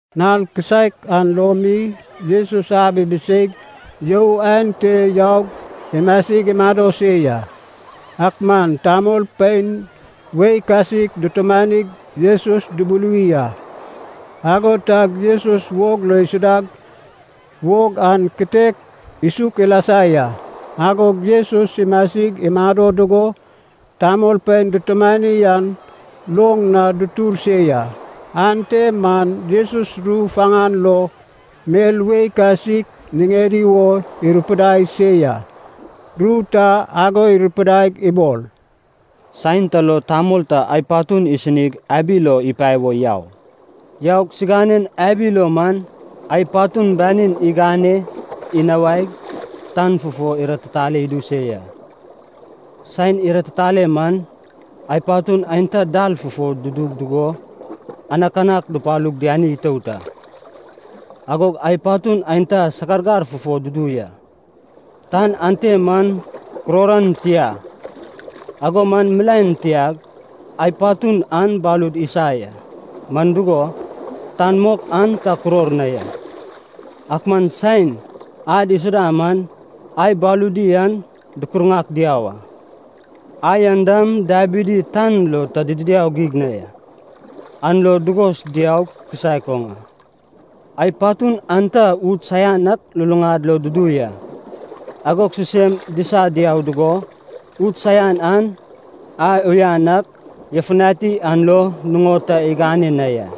Nal kisaek an lo mi Jesus ab ibiseig you aen te yaug imasig imado se ya. Ak man tamolpein wei kasik dutumanig Jesus dubuluwi a. Ago tag Jesus wog lo isudag wog an kitek isuk ilasa ya. Agog Jesus imasig imado dugo, tamolpein dutumani an loŋ na dutur se ya. Ante man Jesus ru faŋan lo mel wei kasik niŋedi wo irupidai se ya. Ru ta ago irupidaig ibol, “Saen ta lo tamol ta ai patun isinig abi lo ipae wo yau. Yaug siŋanen abi lo man ai patun banin igane inawaig tan fufo iratitaleg idu se ya. Saen iratitale man, ai patun aenta dal fufo dudu dugo, anakanak dupalug diani itout a. Agog ai patun aenta sagargar fufo dudu ya, tan ante man kuror an tia, ago man milaen tiag ai patun an balud isa ya, man dugo, tan mok an ta kuror na ya. Ak man saen ad isuda man ai baludi an dukurŋak diau a. Ai an dam dabidi tan lo ta idiau geig na, an lo dugos diau kisaek oŋ a. Ai patun aenta ud saian an luluŋad lo dudu ya, agog sisem disag diau dugo, ud saian an ai uyan ak yafutani an lo nuŋon ta igane na ya.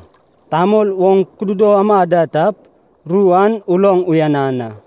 Tamol oŋ kududo ama da tap, ru an uloŋ uyanan a.”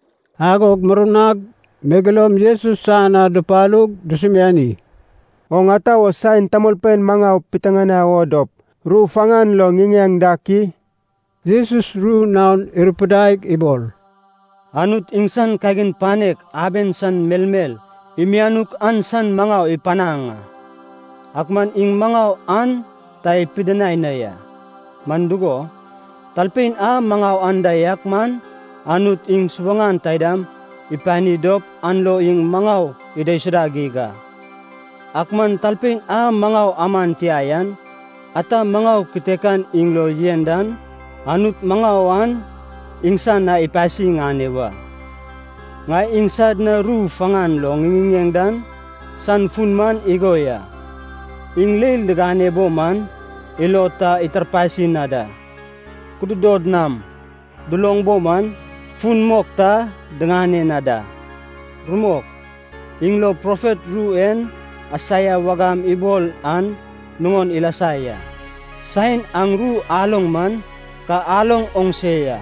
Agog murnag megeloum Jesus san na dupalug dusumiani, “Oŋ ata wo saen tamolpein maŋau piteŋanai o dop ru faŋan lo ŋiŋeŋ dak i?” Jesus ru naon irupidaig ibol, “Anut iŋsan kagin panek aben san melmel imianuk an san maŋau ipanaŋ a. Ak man iŋ maŋau an ta ipidinai na ya. Man dugo, talpein a maŋau anda yak man Anut iŋ subaŋan taidam ipani dop an lo iŋ maŋau idaisuda geig a. Ak man talpein a maŋau aman tia yan, ata maŋau kitekan iŋ lo yen dan, Anut maŋau an iŋsan na ipasi iŋane wa. Ŋai iŋsad na ru faŋan lo ŋiŋiŋeŋ dan san fun man igo ya. ‘Iŋ leil digane bo man, ilod ta itarpasi na da. Kududod nam duloŋ bo man, fun mok ta diŋane na da.’ Rumok, iŋ lo profet ru en Aisaia wagam ibol an nuŋon ilasa ya: ‘Saen aŋ ru aloŋ man, ka aloŋ oŋ se ya,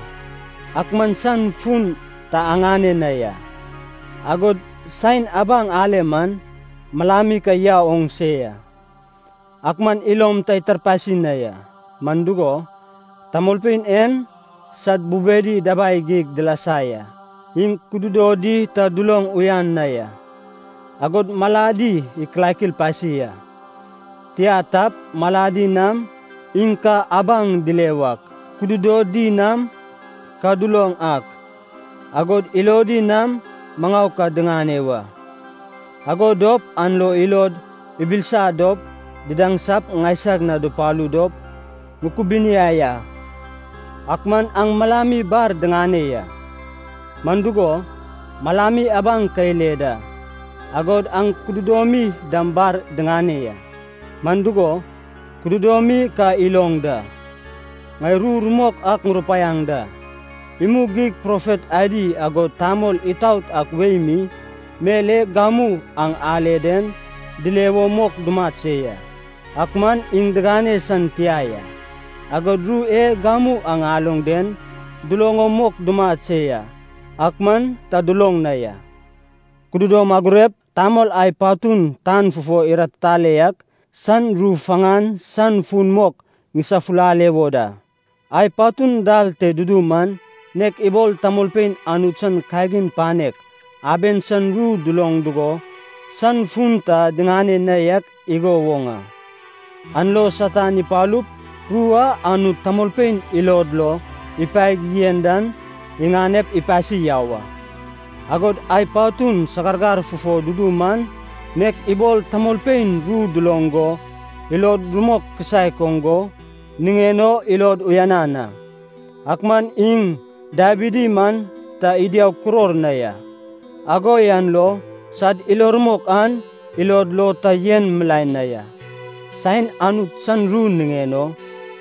ak man san fun ta aŋane na ya, agod saen abaŋ ale man, malami ka yau oŋ se ya, ak man ilom ta itarpasi na ya. Man dugo, tamolpein en sad bubedi dabai geig dilasa ya, iŋ kududodi ta duloŋ uyan na ya, agod maladi ikilakil pasi a. Tia tap, maladi nam iŋ ka abaŋ dile wak, kududodi nam ka duloŋ ak, agod ilodi nam maŋau ka diŋane wa. Ago dop an lo ilod ibilisa dop didaŋsap ŋaisag na dupalu dop ŋukubuniai a.’ Ak man aŋ malami bar diŋane ya, man dugo, malami abaŋ ka ile da, agod aŋ kududomi dam bar diŋane ya, man dugo, kududomi ka iloŋ da. Ŋai ru rumok ak ŋurupaiaŋ da, imug geig profet adi agod tamol itaot ak wei mi, mel e gamu aŋ ale den dile wo mok dumat se ya, ak man iŋ digane san tia ya. Agod ru e gamu aŋ aloŋ den duloŋ o mok dumat se ya, ak man ta duloŋ na ya. “Kududom agurep tamol ai patun tan fufo iratitale yak, san ru faŋan san fun mok ŋisafulale wo da. Ai patun dal te dudu man nek ibol tamolpein Anut san kagin panek aben san ru duloŋ dugo san fun ta diŋane na yak igo woŋ a. An lo Satan ipalup ru a Anut tamolpein ilod lo ipaeg yen dan iŋanep ipasi yau a. Agod ai patun sagargar fufo dudu man, nek ibol tamolpein ru duloŋ go ilod rumok kisaek oŋ go, niŋen o ilod uyanan a. Ak man iŋ dabidi man ta idiaug kuror na ya, ago yan lo sad ilo rumok an ilod lo ta yen milaen na ya. Saen Anut san ru niŋen o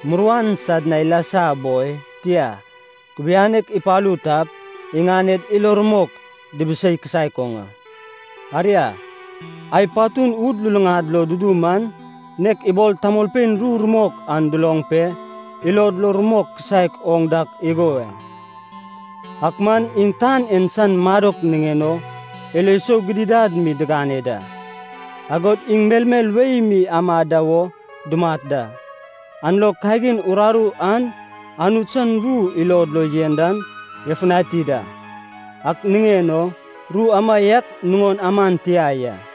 muruan sad na ilasa boi, tia, kubianek ipalu tap, iŋaned ilo rumok dibisei kisaek oŋ a. Aria, ai patun ud luluŋad lo dudu man, nek ibol tamolpein ru rumok an duloŋ pe ilod lo rumok kisaek oŋ dak igo ya. Ak man iŋ tan en san madok niŋen o ilo sou gidigidad mi digane da, agod iŋ melmel wei mi amad da wo dumat da, an lo kagin uraru an Anut san ru ilod lo yen dan yafutani da. Ak niŋen o ru amaiak nuŋon aman tia ya.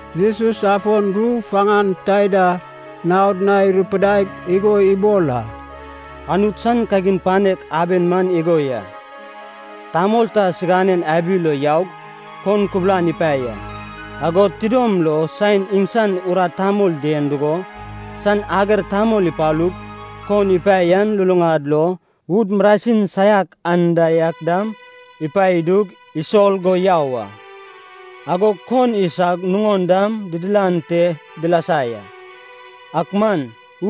Jesus afon ru faŋan taida naod na irupidaig igo ibol a, “Anut san kagin panek aben man igo ya. Tamol ta siganen abi lo yaug kon kubulan ipae ya. Agod tidom lo saen iŋsan urat tamol dien dugo, san ager tamol ipalug kon ipae yan luluŋad lo ud marasin saiak anda yak dam ipae idug, isol go yau a. Agog kon isag nuŋon dam didilan te dilasa ya, ak man,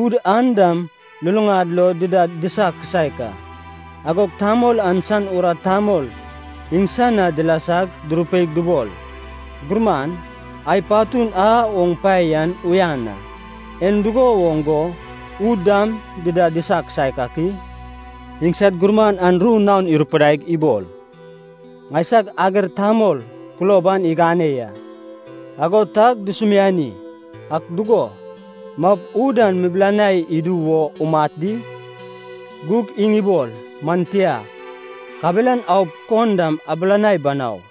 ud an dam luluŋad lo dida disa kisaek a. Agog tamol an san urat tamol iŋsan na dilasag durupeig dubol, ‘Gurman, ai patun a oŋ pae yan uyan a. En dugo woŋ go ud dam dida disa kisaek ak i?’ Iŋsad gurman an ru naon irupidaig ibol, ‘Ŋaisag ager tamol kulob an igane ya.’ Ago tag dusumiani, ‘Ak dugo, maup ud an mubilanai idu wo umat di?’ Gug iŋ ibol, ‘Man tia, kabelan aup kon dam abilanai banau.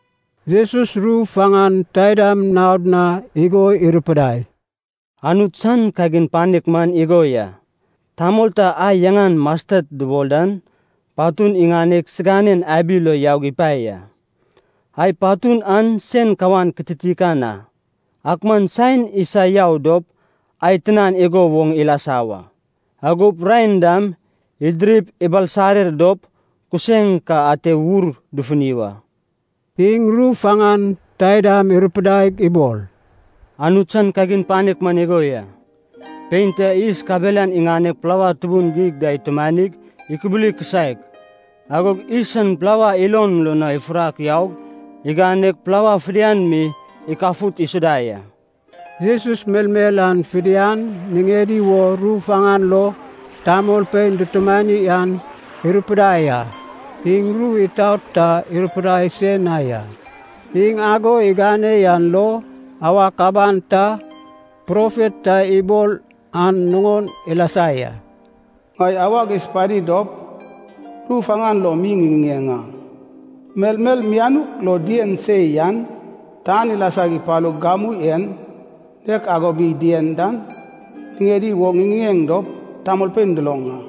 Jesus ru faŋan taidam naod na igo irupidai, “Anut san kagin panek man igo ya. Tamol ta ai yaŋan mastet dubol dan patun iŋaneg siganen abi lo yaug ipae ya. Ai patun an sen kawan kititikan a, ak man saen isa yau dop ai tinan igo woŋ ilasa wa. Agop raen dam idirip ibalsarer dop kuseŋ ka ate wur dufuni wa.” Iŋ ru faŋan taidam irupidaig ibol, “Anut san kagin panek man igo ya. Pein ta yis kabelan iŋaneg plawa tubun geig da itumanig ikubuli kisaek, agog yis an plawa ilon lo ifurak yaug iganeg plawa fidian mi ikafut isuda ya.” Jesus melmel an fidian niŋedi wo ru faŋan lo tamolpein dutumani an irupidai a. Iŋ ru itaot ta irupidai se na ya. Iŋ ago igane yan lo awak aban ta profet ta ibol an nuŋon ilasa ya. “Ŋai awag isupani dop ru faŋan lo mi ŋiŋiŋeŋ a. Melmel mianuk lo dien se yan, tan ilasag ipalug gamu en nek ago mi dien dan, niŋedi wo ŋiŋiŋeŋ dop tamolpein duloŋ a.”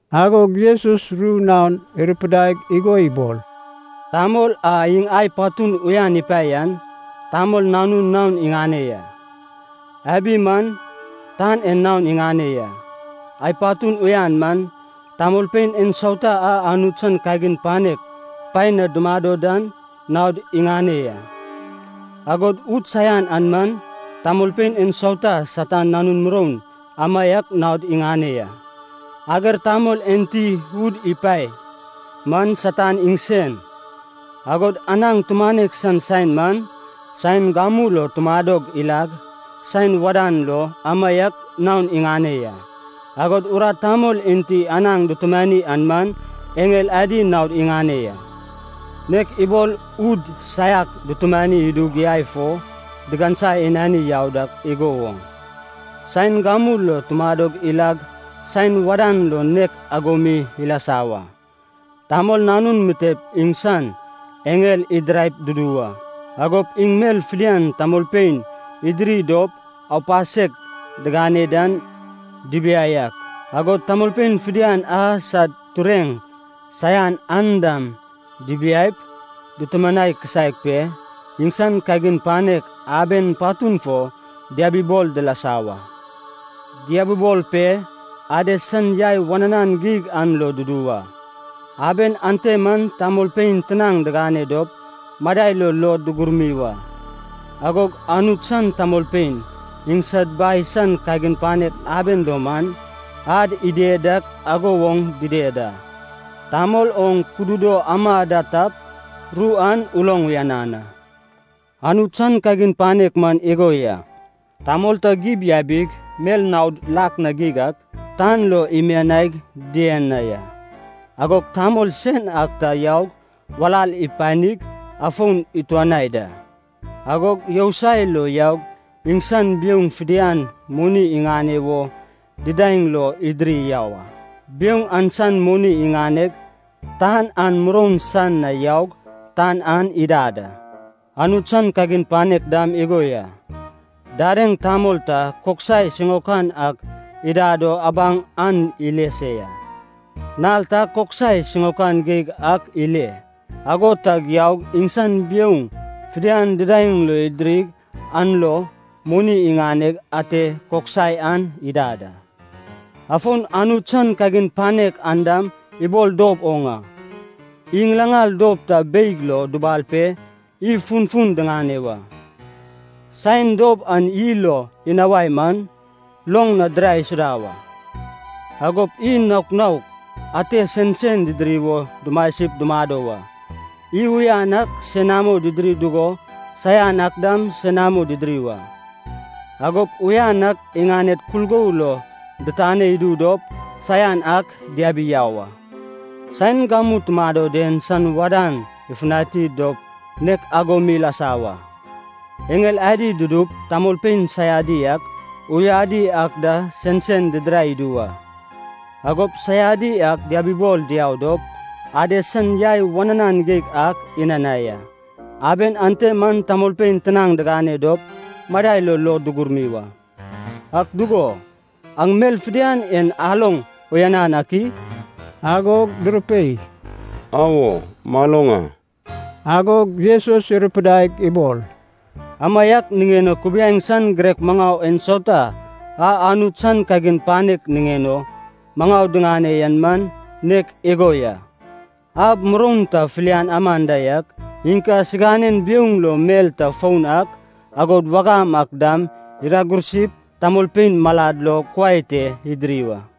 Agog Jesus ru naon irupidaig igo ibol, “Tamol a iŋ ai patun uyan ipae yan, Tamol Nanun naon iŋane ya. Abi man, tan en naon iŋane ya. Ai patun uyan man, tamolpein ensauta a Anut san kagin panek paen na dumado dan naod iŋane ya. Agod ud saian an man, tamolpein ensauta a Satan nanun muroun amaiak naod iŋane ya. Ager tamol enti ud ipae man Satan iŋsen, agod anaŋ tumanek san saen man, saen gamu lo tumadog ilag san wadan lo amaiak naon iŋane ya. Agod urat tamol enti anaŋ dutumani an man, eŋel adi naod iŋane ya. Nek ibol ud saiak dutumani idup yai fo digansa inani yau dak igo woŋ, saen gamu lo tumadog ilag san wadan lo nek ago mi ilasa wa. Tamol Nanun mitep iŋsan eŋel idiraip dudu wa. Agop iŋ mel fidian tamolpein idiri dop aupasek digane dan dibiai ak, agod tamolpein fidian a sad tureŋ saian an dam dibiaip, dutumanai kisaek pe iŋsan kagin panek aben patun fo diabibol dilasa wa. Diabibol pe Ades san yai wananan geig an lo dudu wa. Aben ante man tamolpein tinaŋ digane dop madai lo luod dugurmi wa. Agog Anut san tamolpein, iŋsad Bai san kagin panek aben lo man, ad ided dak ago woŋ dided a. Tamol oŋ kududo ama da tap, ru an uloŋ uyanan a.” “Anut san kagin panek man igo ya. Tamol ta gib yabig mel naod lak na geig ak tan lo imianaig dien na ya. Agog tamol sen ak ta yaug walal ipanig afon ituanai da. Agog yousai lo yaug iŋsan biouŋ fidian moni iŋane wo didaeŋ lo idiri yau a. Biouŋ an san moni iŋaneg tan an muroun san na yaug tan an idad a. “Anut san kagin panek dam igo ya. Dadeŋ tamol ta koksai siŋaokan ak idad o abaŋ an ile se ya. Nal ta, koksai siŋaokan geig ak ile, ago tag yaug iŋsan biouŋ fidian didaeŋ lo idirig an lo moni iŋaneg ate koksai an idad a. “Afon Anut san kagin panek an dam ibol dob oŋ a. Iy ŋilaŋal dob ta beig lo dubal pe iy funfun diŋane wa. Saen dob an iy lo inawai man, loŋ na dirae isuda wa. Agop iy naok naok atem sensen didiri wo dumasip dumado wa. Iy uyan ak senamo didiri dugo saian ak dam senamo didiri wa. Agop uyan ak iŋaned kulgou lo ditane idu dop, saian ak diabi yau a. Saen gamu tumado den san wadan ifutani dop nek ago mi ilasa wa. Eŋel adi dudup tamolpein saiadi ak, uyadi ak da, sensen didirai idu wa. Agop saiadi ak diabibol diau dop Ades san yai wananan geig ak inanai a. Aben ante man tamolpein tinaŋ digane dop madai lo luod dugurmi wa.” “Ak dugo, aŋ mel fidian en aloŋ uyanan ak i?” Agog durupei, “Awo, maloŋ a.” Agog Jesus irupidaig ibol, “Amaiak niŋen o kubiaeŋ san girek maŋau ensauta a Anut san kagin panek niŋen o maŋau diŋane yan man nek igo ya. Ab muroun ta filian aman da yak, iŋ ka siganen biouŋ lo mel ta foun ak, agod wagam ak dam, iragursip tamolpein malad lo kuai te idiri wa.”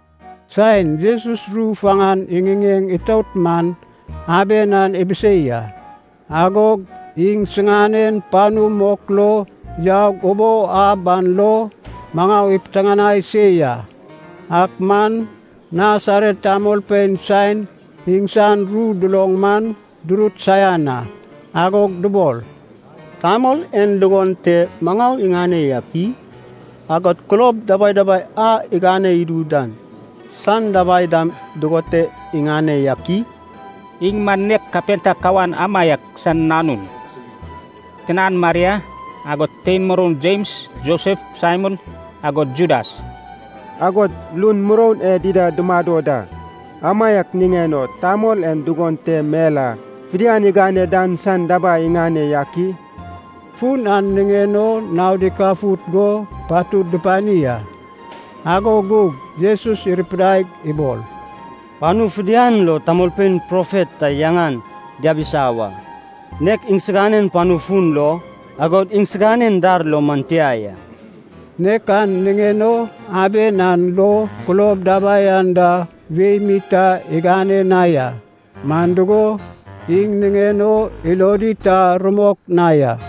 Saen Jesus ru faŋan iŋiŋeŋ itout man aben an ibisei a. Agog iŋsiŋanen panu mok lo yaug ubou ab lo maŋau ipiteŋanai se ya. Ak man Nasaret tamolpein saen iŋsan ru duloŋ man durut saian a. Agog dubol, “Tamol en dugon te maŋau iŋane yak i? Agod kulob dababai a igane idu dan san dabai dam dugon te iŋane yak i? Iŋ man nek kapenta kawan amaiak san nanun, tinan Maria, agod tein moroun Jems, Josef, Saimon agod Judas. Agod lun moroun e dida tumado da! Amaiak niŋen o tamol en dugon te mel a fidian igane dan san dabai iŋane yak i?” Fun an niŋen o naod ikafut go patud dupani a. Ago gug Jesus irupidaig ibol, “Panu fidian lo tamolpein profet ta yaŋan diabisa wa, nek iŋsiganen panu fun lo, agod iŋsiganen dar lo man tia ya.” Nek an niŋen o aben an lo kulob dabai anda wei mi ta igane na ya, man dugo, iŋ niŋen o ilodi ta rumok na ya.